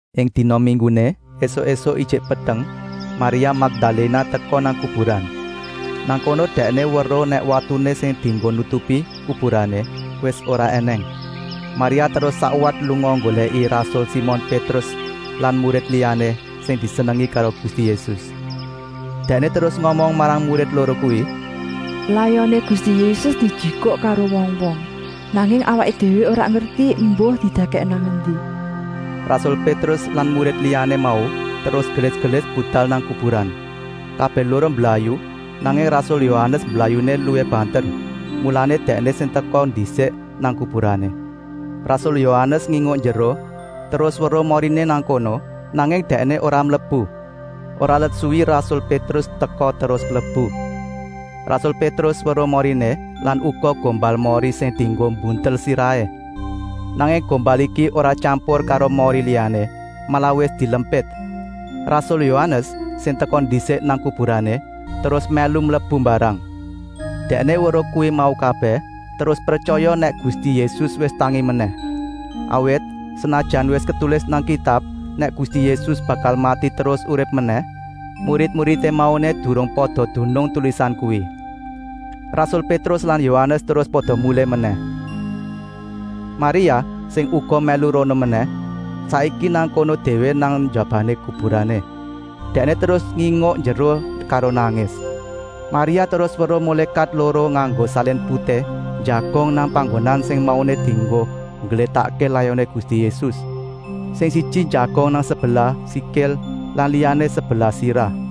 Ing dina mingguné, ésuk-ésuk ijik peteng, Maria Makdaléna teka nang kuburan. Nang kono dèkné weruh nèk watuné sing dienggo nutupi kuburané wis ora ènèng. Maria terus sakwat lunga nggolèki rasul Simon Pétrus lan murid liyané sing disenengi karo Gusti Yésus. Dèkné terus ngomong marang murid loro kuwi: “Layoné Gusti Yésus dijikuk karo wong-wong, nanging awaké déwé ora ngerti embuh didèkèk nang endi.” Rasul Pétrus lan murid liyané mau terus gelis-gelis budal nang kuburan. Kabèh loro mblayu, nanging rasul Yohanes mblayuné luwih banter, mulané dèkné sing teka ndisik nang kuburané. Rasul Yohanes nginguk njeruh terus weruh moriné nang kono, nanging dèkné ora mlebu. Ora let suwi rasul Pétrus teka terus mlebu. Rasul Pétrus weruh moriné lan uga gombal mori sing dienggo mbuntel sirahé. Nanging gombal iki ora tyampur karo mori liyané, malah wis dilempit. Rasul Yohanes, sing teka ndisik nang kuburané, terus mèlu mlebu mbarang. Dèkné weruh kuwi mau kabèh terus pretyaya nèk Gusti Yésus wis tangi menèh. Awit, senajan wis ketulis nang Kitab nèk Gusti Yésus bakal mati terus urip menèh, murid-muridé mauné durung pada dunung tulisan kuwi. Rasul Pétrus lan Yohanes terus pada mulih menèh. Maria, sing uga mèlu rono menèh, saiki nang kono déwé nang njabané kuburané. Dèkné terus nginguk njeruh karo nangis. Maria terus weruh mulékat loro nganggo salin putih njagong nang panggonan sing mauné dienggo ngglétakké layoné Gusti Yésus. Sing siji njagong nang sebelah sikil lan liyané sebelah sirah.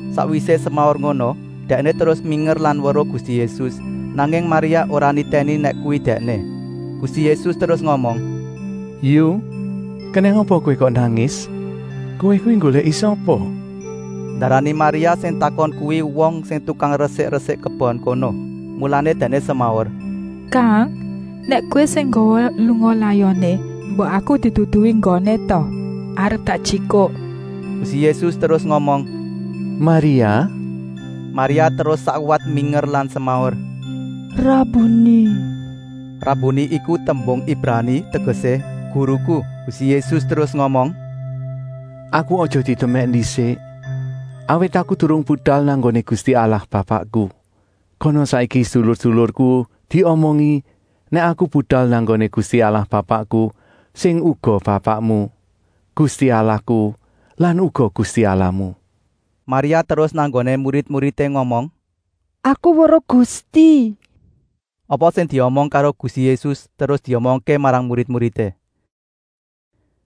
Sakwisé semaur ngono dèkné terus minger lan weruh Gusti Yésus, nanging Maria ora nitèni nèk kuwi Dèkné. Gusti Yésus terus ngomong: “Yu, kenèng apa kowé kok nangis? Kowé kuwi nggolèki sapa?” Ndarani Maria sing takon kuwi wong sing tukang resik-resik kebon kono, mulané dèkné semaur: “Kang, nèk kowé sing nggawa lunga layoné, mbok aku diduduhi nggoné ta, arep tak jikuk!” Gusti Yésus terus ngomong: “Maria!” Maria terus sakwat minger lan semaur: “Rabuni!” (Rabuni iku tembung Ibrani tegesé: “Guruku.”) Gusti Yésus terus ngomong: “Aku aja didemèk ndisik, awit Aku durung budal nang nggoné Gusti Allah Bapakku. Kana saiki sedulur-sedulurku diomongi nèk Aku budal nang nggoné Gusti Allah Bapakku sing uga Bapakmu, Gusti Allahku lan uga Gusti Allahmu.” Maria terus nang nggoné murid-muridé ngomong: “Aku weruh Gusti!” Apa sing diomong karo Gusti Yésus terus diomongké marang murid-muridé.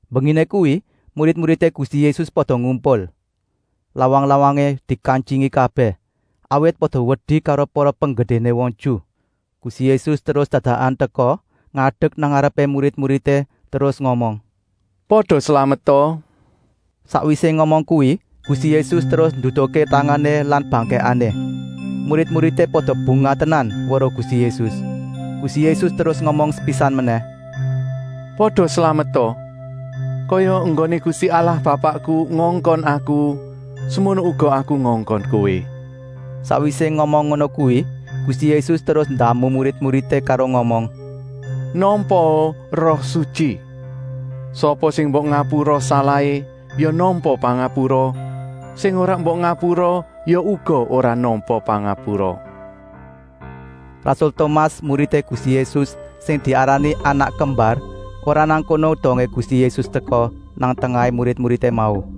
Mbenginé kuwi murid-muridé Gusti Yésus pada ngumpul. Lawang-lawangé dikantyingi kabèh, awit pada wedi karo para penggedéné wong Ju. Gusti Yésus terus dadakan teka ngadek nang ngarepé murid-muridé terus ngomong: “Pada slameta!” Sakwisé ngomong kuwi Gusti Yésus terus nduduhké tangané lan bangkèkané. Murid-muridé pada bungah tenan weruh Gusti Yésus. Gusti Yésus terus ngomong sepisan menèh: “Pada slameta! Kaya enggoné Gusti Allah Bapakku ngongkon Aku, semono uga Aku ngongkon kowé.” Sakwisé ngomong ngono kuwi Gusti Yésus terus ndamu murid-muridé karo ngomong: “Nampaa Roh Sutyi! Sapa sing mbok ngapura salahé ya nampa pangapura, sing ora mbok ngapura ya uga ora nampa pangapura.” Rasul Tomas, muridé Gusti Yésus sing diarani Anak Kembar, ora nang kono dongé Gusti Yésus teka nang tengahé murid-muridé mau.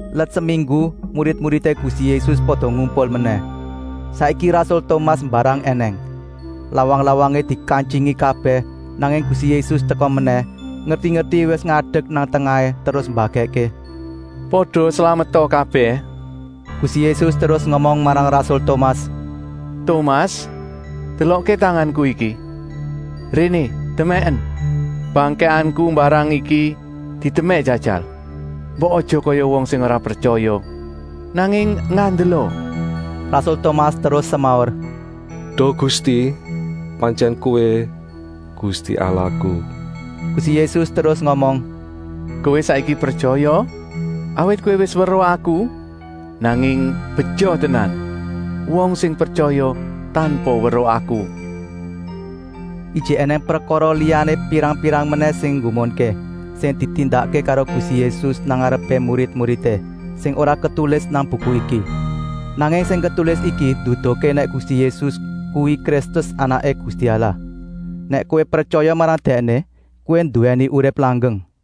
Let seminggu murid-muridé Gusti Yésus pada ngumpul menèh. Saiki rasul Tomas mbarang ènèng. Lawang-lawangé dikantyingi kabèh, nanging Gusti Yésus teka menèh, ngerti-ngerti wis ngadek nang tengahé terus mbagèkké: “Pada slameta kabèh!” Gusti Yésus terus ngomong marang rasul Tomas: “Tomas, delokké tanganku iki, réné demèken. Bangkèkanku mbarang iki didemèk jajal! Mbok aja kaya wong sing ora pretyaya, nanging ngandela!” Rasul Tomas terus semaur: “Duh Gusti, pantyèn Kowé Gusti Allahku.” Gusti Yésus terus ngomong: “Kowé saiki pretyaya, awit kowé wis weruh Aku. Nanging beja tenan wong sing pretyaya tanpa weruh Aku!” Ijik ènèng prekara liyané pirang-pirang menèh sing nggumunké, sing ditindakké karo Gusti Yésus nang ngarepé murid-muridé, sing ora ketulis nang buku iki. Nanging sing ketulis iki nduduhké nèk Gusti Yésus kuwi Kristus Anaké Gusti Allah. Nèk kowé pretyaya marang Dèkné, kowé nduwèni urip langgeng.